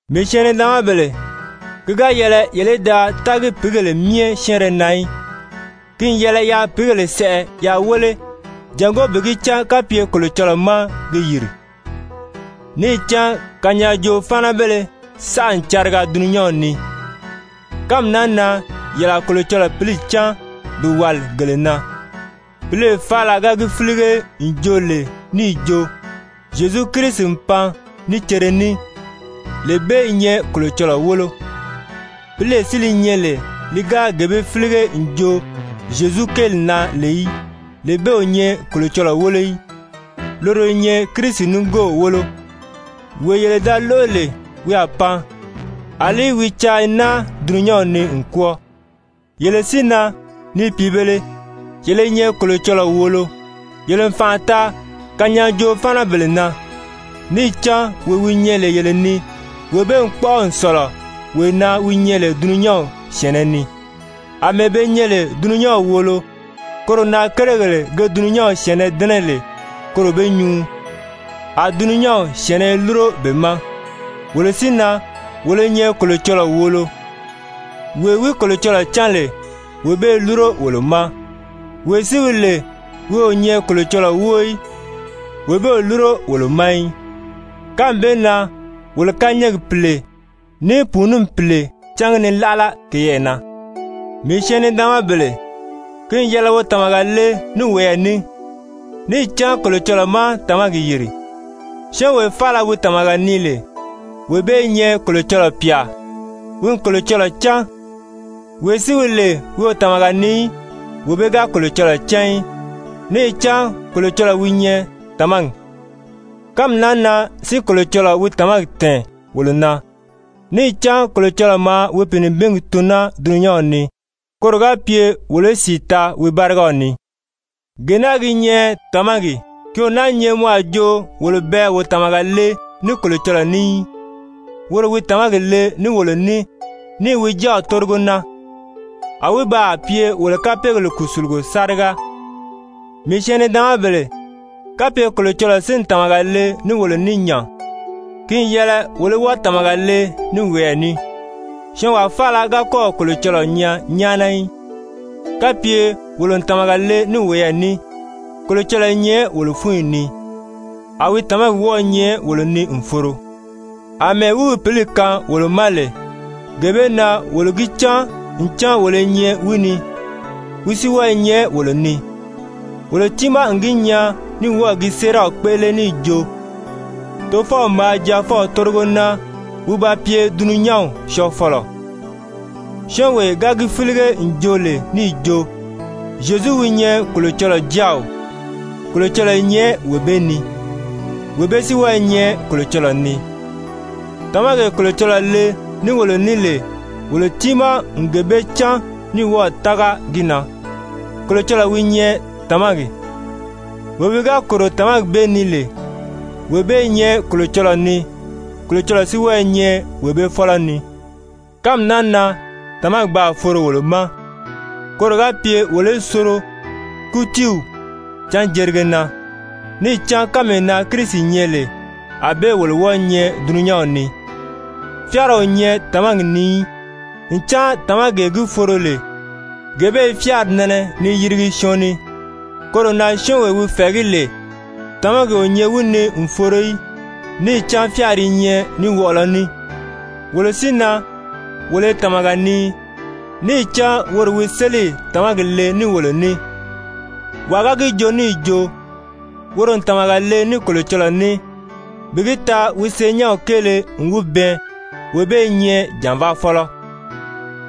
Mii syɛɛn-nidaanmabèle, ki ga yɛlɛ yele í da tági pìígèle myɛ syɛ́ɛnrɛ na í. Ki n yɛlɛ yaa pìígèle sɛʔɛ yaa wéle jàngó bi gi cán kapye Kolocɔlɔɔ má ge yìri, níì cán kanyaajoo-fáanabéle saʔa n cariga dulunyanw ni. Kánmi naa na yele a Kolocɔlɔɔ Pǐli cán bi wàli gele na, pǐlee faala ga gi fílige n joo lè níì jo Zyezu Kirisi n pan ní cere ní, lee bee i nyɛ Kolocɔlɔɔ wólo, pǐlee si li nyɛ lè li ga gee bee fílige n joo Zyezu kéeli na lè í, lee bee o nyɛ Kolocɔlɔɔ wólo í, loro i nyɛ Kirisi nigoow wólo, wee yele da lóʔo lè wi a pan, àlí wi caa i naa dulunyanw ni n kwɔ́ɔ. Yele si na, ni pìibēle, yele i nyɛ Kolocɔlɔɔ wòolo. Yele n fànʔa taa kanyaajoo-fáanabèle na, níì cán wee wi nyɛ lè yele ni, wee bee n kpɔ́ʔɔ n sɔ̀lɔ wee na wi nyɛ lè dulunyanw syɛ̀ɛnnɛ ni. Amɛɛ be nyɛ lè dulunyanw wòolo, koro na kérigèle ge dulunyanw syɛ̀ɛnnɛ dɛ́nɛ lè koro be nyuu, a dulunyanw syɛ̀ɛnnɛ i lúro be ma. Wolo si na, wolo i nyɛ Kolocɔlɔɔ wòolo. Wee wi Kolocɔlɔɔ cán lè, wee bee i lúro wolo ma. Wee si wi lè wi o nyɛ Kolocɔlɔɔ wóo í, wee bee o lúro wolo ma í. Kánmi bee na wolo kányɛɛgi Pìle ní pùununi pìle cángi ni láʔala keyɛɛ na. Mii syɛɛn-nidaanmabèle, ki n yɛlɛ wo tàmaga le ní woyɛɛ ní, níì cán Kolocɔlɔɔ má tàmagi yìri, syɔ́ɔnwee faala wi tàmaga nii lè, wee bee i nyɛ Kolocɔlɔɔ pyà, wi n Kolocɔlɔɔ cán. Wee si wi lè wi o tàmaga nii í, wee bee ga Kolocɔlɔɔ cán í, níì cán Kolocɔlɔɔ wi nyɛ tàmagi. Kánmi naa na si Kolocɔlɔɔ wi tàmagi tɛ̀ɛn wolo na, níì cán Kolocɔlɔɔ maa wi Pìinibingi tun naa dulunyanw ni koro ga pye wolo í sìi taa wi bárigaw ni. Gee naa gi nyɛ tàmagi, ki o náā nyɛ mɔ a jo wolo bɛɛ wo tàmaga le ní Kolocɔlɔɔ ní í, woro wi tàmagi le ní wolo ní níì wi Jáaw tórigo naa. A wi baa pye wolo kapeegèle kùsulugo sáriga. Mii syɛɛn-nidaanmabèle, kapye Kolocɔlɔɔ si n tàmaga le ní wolo ní nya, ki n yɛlɛ wolo í wɔ́ɔ tàmaga le ní woyɛɛ ní. Syɔɔnwaa faala ga kɔ́ɔ̀ Kolocɔlɔɔ nyaa nyáana í. Kapye wolo n tàmaga le ní woyɛɛ ní, Kolocɔlɔɔ i nyɛ wolo fúnyi ni, a wi tàmagi wɔ́ɔ i nyɛ wolo ni n foro. Amɛɛ wi wi Pǐli kaan wolo ma lè, gee bee na wolo gi cán ncan wolo i nyɛ wi ni, wi si wɔ́ɔ i nyɛ wolo ni. Wolo tiimaa n gi nyaa ní wɔ́ɔ̀ gi séeraw kpéʔele níì jo Tofɔw maa Jaafɔw tórigo naa wi ba pye dulunyanw Syɔɔfɔlɔ. Syɔ́ɔnwee ga gi fílige n joo lè níì jo Zyezu wi nyɛ Kolocɔlɔɔ Jáaw, Kolocɔlɔɔ i nyɛ wee bee ni, wee bee si wɔ́ɔ i nyɛ Kolocɔlɔɔ ni. Tàmagee Kolocɔlɔɔ le ní wolo ní lè, wolo tiimaa n gee bee cán ní wɔ́ɔ̀ tága gi na. Kolocɔlɔɔ wi nyɛ tàmagi. Wee wi ga kòro tàmagi bee ni lè, wee bee i nyɛ Kolocɔlɔɔ ni, Kolocɔlɔɔ si wɔ́ɔ i nyɛ wee bee fɔ́lɔ ni. Kánmi naa na tàmagi baa foro wolo ma, koro ga pye wolo í soro kútiiw canjerige na, níì cán kánmee na Kirisi nyɛ lè, ànbée wolo wɔ́ɔ̄ nyɛ dulunyanw ni. Fyáara o nyɛ tàmagi ni í, ncan tàmagee gi foro lè, gee bee i fyáari nɛnɛ ni yirigi syɔɔn ni. Koro na syɔ́ɔnwee wi fɛ̀ɛgí lè, tàmagi o nyɛ wi ni n foro í, níì cán fyáari i nyɛ ní wɔʔɔlɔ ní. Wolo si na, wolo i tàmaga nii, níì cán woro wi sélì tàmagi le ní wolo ní. Wàa ga gi joo níì jo woro n tàmaga le ní Kolocɔlɔɔ ní, bi gi taa wi senyɛnw kéele n wi bɛɛn wee bee i nyɛ jànvaafɔlɔ,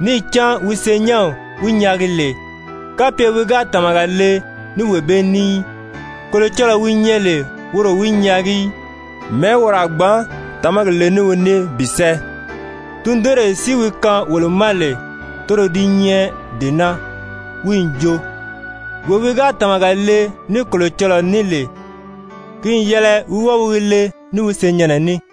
níì cán wi senyɛnw wi nyaagi lè, kapye wi ga tàmaga le ní wee bee ní í, Kolocɔlɔɔ wi nyɛ lè woro o wi nyaagi í, mɛ̀ɛ́ woro a gbǎn tàmagi le ní wi ní bi sɛ́ɛ? Tundunree si wi kaan wolo ma lè, toro di nyɛ dee naa, wi n jo, wee wi ga tàmaga le ní Kolocɔlɔɔ ní lè, ki n yɛlɛ wi wɔ́ɔ wi gi le ní wi senyɛnnɛ ní.